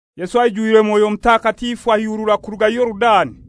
Yesu aijwire Mwoyo Mutakatifu aihurura kuruga Yorudani.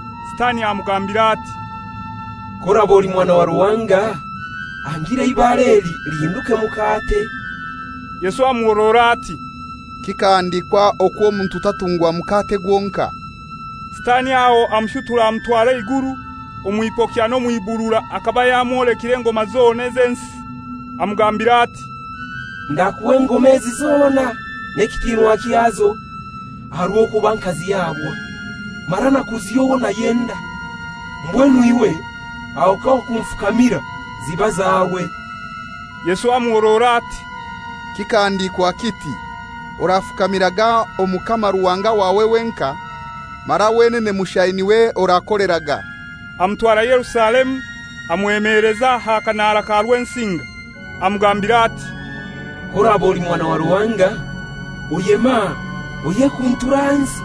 Sitani amugambira ati, «K'oraba oli Mwana wa Ruhanga, hanga eibare eli lihinduke mukate.» Yesu amuhorora ati, «Kikahandikwa okwo omuntu tatungwa mukate gwonkai.» Sitani aho amushutura amutwara eiguru, omw'ipokya n'omw'ibuurura akaba yamwolekire engoma zona z'ensi. Amugambira ati, «Ndakuha engoma ezi zona n'ekitinwa kyazo, aha rw'okuba nkazihabwa, mara nakuziha owo nayenda. Mbwenu iwe aho kawakunfukamira, ziba zawe.» Yesu amuhorora ati, «Kikahandikwa kiti, ‹Orafukamiraga Omukama Ruhanga wawe wenkai, mara wenene mushai n'iwe orakoleraga.›» Amutwara Yerusalemu, amwemeleza aha kanara ka Rwensinga, amugambira ati, «K'oraba oli Mwana wa Ruhanga, oyeme aha oyekunture ahansi.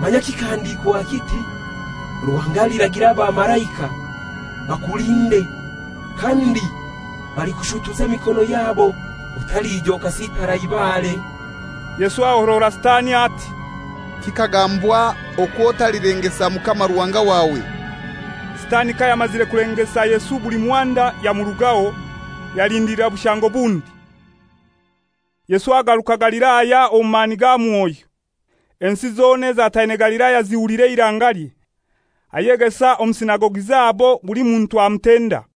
Manya kikahandikwa kiti, ‹Ruhanga aliragira abamalaika bakulinde,› kandi, ‹Balikushutuza emikono yabo, otalija okasitara aha ibare.›» Yesu ahorora Sitani ati, «Kikagambwa okwo otalilengesa Mukama Ruhanga wawe.» Sitani kayamazire kulengesa Yesu buli muhanda yamurugaho, yalindilira bushango bundi. Yesu agaruka Galilaya omu mani ga Mwoyo. Ensi zona ezataine Galilaya zihulira eirangalye. Ayegesa omu sinagogi zabo, buli muntu amutenda.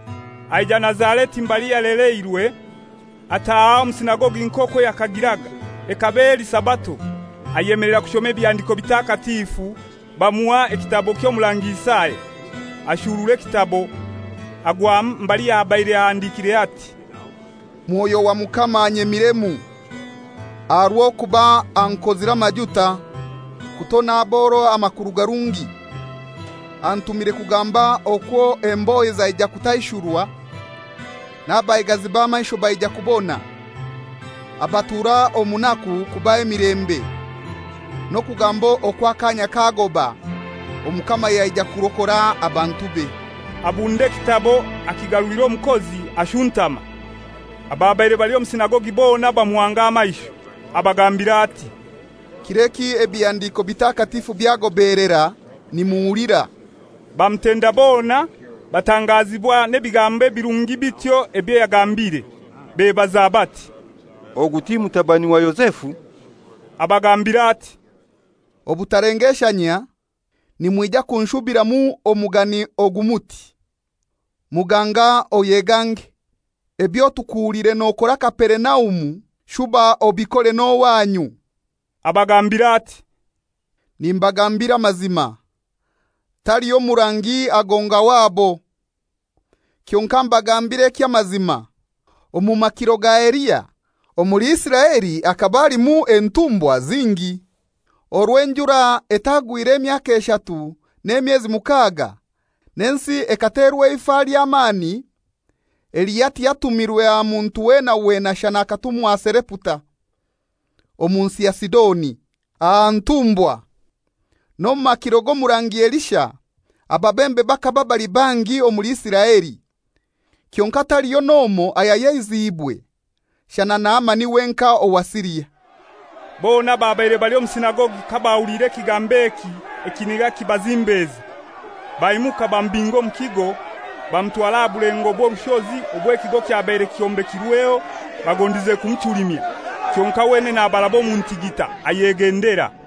Aija Nazareti mbali yalereirwe. Ataaha omu sinagogi nk'okwo yakagiraga, ekaba eli Sabato. Ayemelera kushoma Ebihandiko bitakatifu; bamuha ekitabo ky'Omurangi Isaya. Ashurura ekitabo, agwamu mbali habaire ahandikire ati, «Mwoyo wa Mukama anyemiremu, aha rw'okuba ankozire amajuta kutona aboro amakuru garungi. Antumire kugamba okwo embohe zaija kutaishurwa, n'abaigazi b'amaisho baija kubona, abatura omu naku kubaha emilembe; n'okugamba okwo akaanya kagoba, Omukama yaija kurokora abantube.» Abunda ekitabo, akigarulira omukozi, ashuntama. Ababaire bali omu sinagogi bona bamuhanga amaisho. Abagambira ati, «Kir'eki ebihandiko bitakatifu byagobelera nimuhulira.» Bamutenda bona, batangazibwa n'ebigambo ebirungi bityo ebyo yagambire. Bebaza bati, «Ogu ti mutabani wa Yozefu?» Abagambira ati, «Obutalengeshanyia, nimwija kunshubiramu omugani ogu muti, ‹Muganga oyegange; ebyo tukuhuliire nokora Kaperinaumu shuba obikore n'owanyu!›» Abagambira ati, «Nimbagambira amazima, taliho murangi agonga wabo. Kyonkai mbagambire eky'amazima, omu makiro ga Eliya omuli Isiraeli hakaba halimu entumbwakazi zingi, orwo enjura etagwire emyaka eshatu n'emyezi mukaga, n'ensi ekaterwa eifa ly'amani. Eliya tiyatumirwe aha muntu weena weena shana akatumwa Sareputa, omu nsi ya Sidoni, aha ntumbwakazi. N'omu makiro g'omurangi Elisha, ababembe bakaba bali bangi omuli Isiraeli, kyonkai taliyo n'omoi ayayeziibwe, shana Naamani wenkai owa Siria.» Bona ababaire bali omu sinagogi kabahuliire ekigambo eki ekiniga kibazimbeza. Baimuka bamubinga omu kigo, bamutwara aha bulengo bw'orushozi obw'ekigo kyabaire kyombekirweho, bagondize kumuchulimya. Kyonkai wenene abaraba omu ntigita, ayegendera.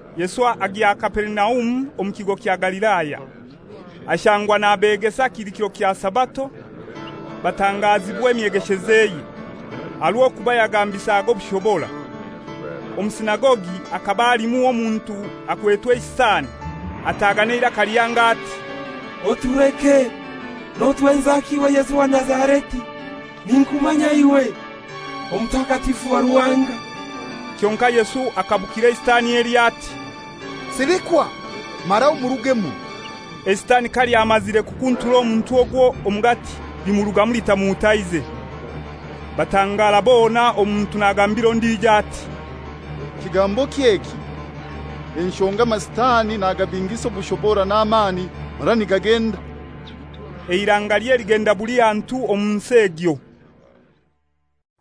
Yesu agya Kaperinaumu omu kigo kya Galilaya. Ashangwa nabegesa kili kiro kya Sabato; batangazibwa emyegeshezeye. Aha rw'okuba yagambisaga obushobora. Omu sinagogi hakaba halimu omuntu akwetwe eisitani, ataaga n'eiraka lihango ati, «Otuleke! Notwenzaki iwe Yesu owa Nazareti? Ninkumanya iwe, Omutakatifu wa Ruhanga!» Kyonkai Yesu akabukira eisitani elyo ati, «Silikwa, mara omurugemu!» Eisitani kalyamazire kukuntura omuntu ogwo omugati, limurugamu litamuhutaize. Batangara bona, omuntu nagambira ondijo ati, «Kigamboki eki? Enshonga amasitani nagabingisa obushobora n'amani mara nigagenda!» Eirangalye ligenda buli hantu omu nsi egyo.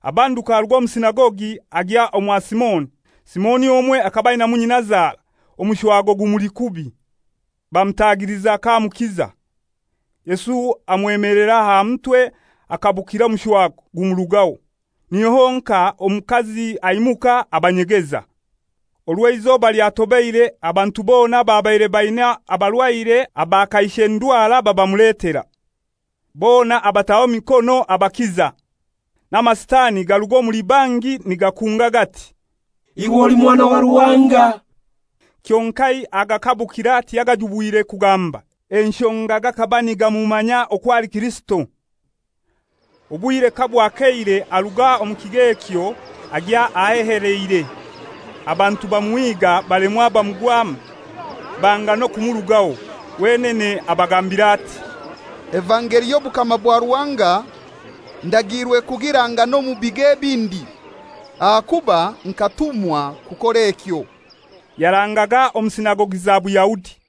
Abanduka aruga omu sinagogi, agya omwa Simoni. Simoni omwe akaba ainamu nyinazara, omushwago gumuli kubi. Bamutagiliza k'amukiza. Yesu amwemelera aha mutwe akabukira omushwago, gumurugaho. Niho honkai omukazi aimuka abanyegeza. Orwo eizoba lyatobeire, abantu bona ababaire baina abarwaire aba kaishe ndwara babamuletera. Bona abataho emikono abakiza. N'amasitani garuga omuli bangi nigakunga gati, «Iwe oli Mwana wa Ruhanga!» Kyonkai agakabukira tiyagajubwire kugamba, enshonga gakaba nigamumanya okwo ali Kirisito. Obwire kabwakeire, aruga omu kigo ekyo, agya aheheleire. Abantu bamuhiga balemwa bamugwamu, banga n'okumurugaho. Wenene abagambira ati, «Evangeli y'obukama bwa Ruhanga ndagiirwe kugiranga n'omu bigo ebindi, ahakuba nkatumwa kukora ekyo.» Yarangaga omu sinagogi za Buyahudi.